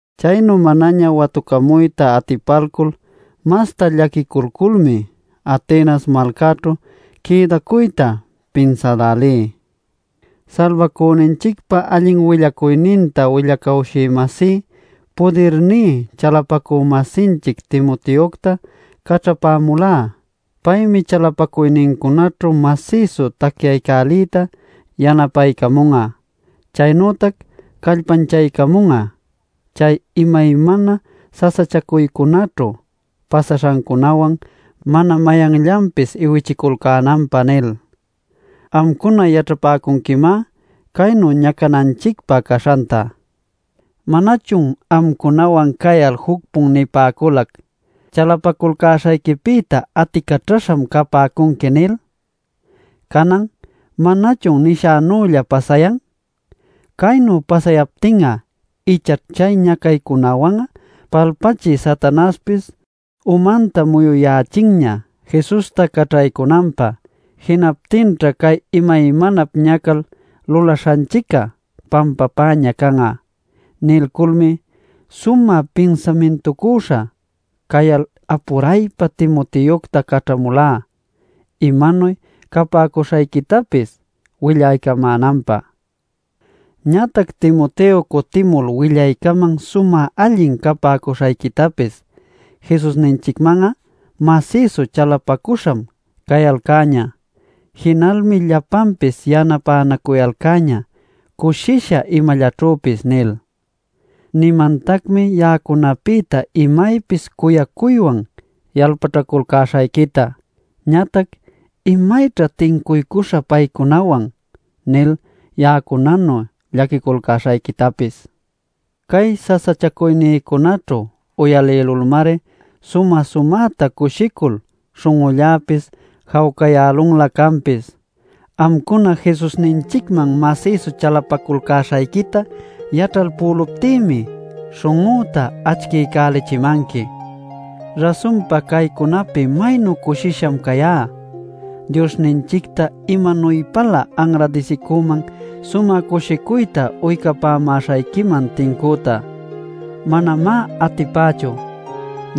Chaynu manaña watucamuyta atipalcul masta llaquiculculmi, Atenas malcaćhu quïdacuyta pinsälälí. Salbacüninchicpa allin willacuyninta willacawshï-masí pudirní chalapacü-masinchic Timoteocta caćhapämulá “Paymi chalapacuynincunaćhu masïsu tacyaycäliyta yanapaycamun'a, chaynütac callpanchaycamun'a chay imaymana sasachacuycunäćhu pasaśhancunäwan mana mayanllanpis iwichiculcänanpä” nil. Amcuna yaćhapäcunquimá caynu ñacananchicpä caśhanta. ¿Manachun amcunawan cayal juc-pun nipäculac: “Chalapaculcäśhayquipïta aticaćhaśham capäcunqui” nil? Canan ¿manachun nishänülla pasayan? “Caynu pasayaptin'a ichaćh chay ñacaycunawan'a Palpachï Satanaśhpis umanta muyuyächinña Jesusta caćhaycunanpä. Jinaptinćha cay imaymanap ñacal lulaśhanchic'a pampapäña can'a” nilculmi, sumä pinsamintucüśha cayal apuraypa Timoteocta caćhamulá, imanuy capäcuśhayquitapis willaycamänanpä. Ñatac Timoteo cutïmul, willaycaman sumä allin capäcuśhayquitapis “Jesusninchicman'a masïsu chalapacüśham cayalcäñä. Jinalmi llapanpis yanapänacuyalcäñä cushisha imallaćhüpis” nil. Nimantacmi ya'acunapïta imaypis cuyacuywan yalpaćhaculcäśhayquita, ñatac “¿Imayćha tincuycuśhun paycunawan?” nil ya'acunanu llaquiculcäśhayquitapis. Cay sasachacuynïcunäćhu uyalïlulmari sumä-sumäta cushicul śhun'ulläpis jawcayälunlä canpis. Amcuna Jesusninchicman masïsu chalapaculcäśhayquita yaćhalpüluptïmi śhun'üta acchiycälichimanqui. ¡Rasunpa caycunapi maynu cushisham cayá! ¡Diosninchicta imanuypälä anradisicüman sumä cushicuyta uycapamäśhayquiman tincüta! ¡Manamá atipächu!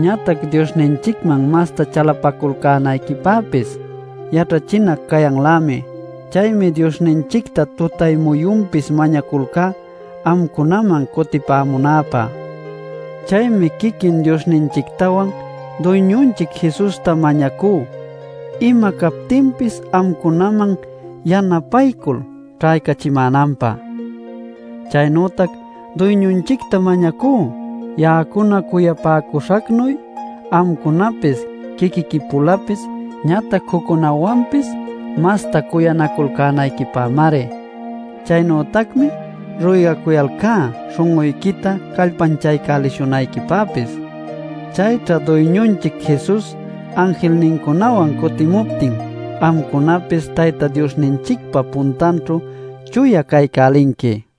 Ñatac Diosninchicman masta chalapaculcänayquipäpis yaćhachinac cayanlämi. Chaymi Diosninchicta tutay-muyunpis mañaculcá amcunaman cutipämunäpä. Chaymi quiquin Diosninchictawan Duyñuninchic Jesusta mañacú ima captinpis amcunaman yanapaycul ćhächimänanpä. Chaynütac Duyñunchicta mañacú, ya'acuna cuyapäcuśhacnuy, amcunapis quiquiqui-pulapis ñatac juccunawanpis masta cuyanaculcänayquipämari. Chaynütacmi, ruygacuyalcá śhun'uyquita callpanchaycälishunayquipäpis. Chayćha Duyñunchic Jesus anjilnincunawan cutimuptin amcunapis Tayta Diosninchicpa puntanćhu chuya caycälinqui.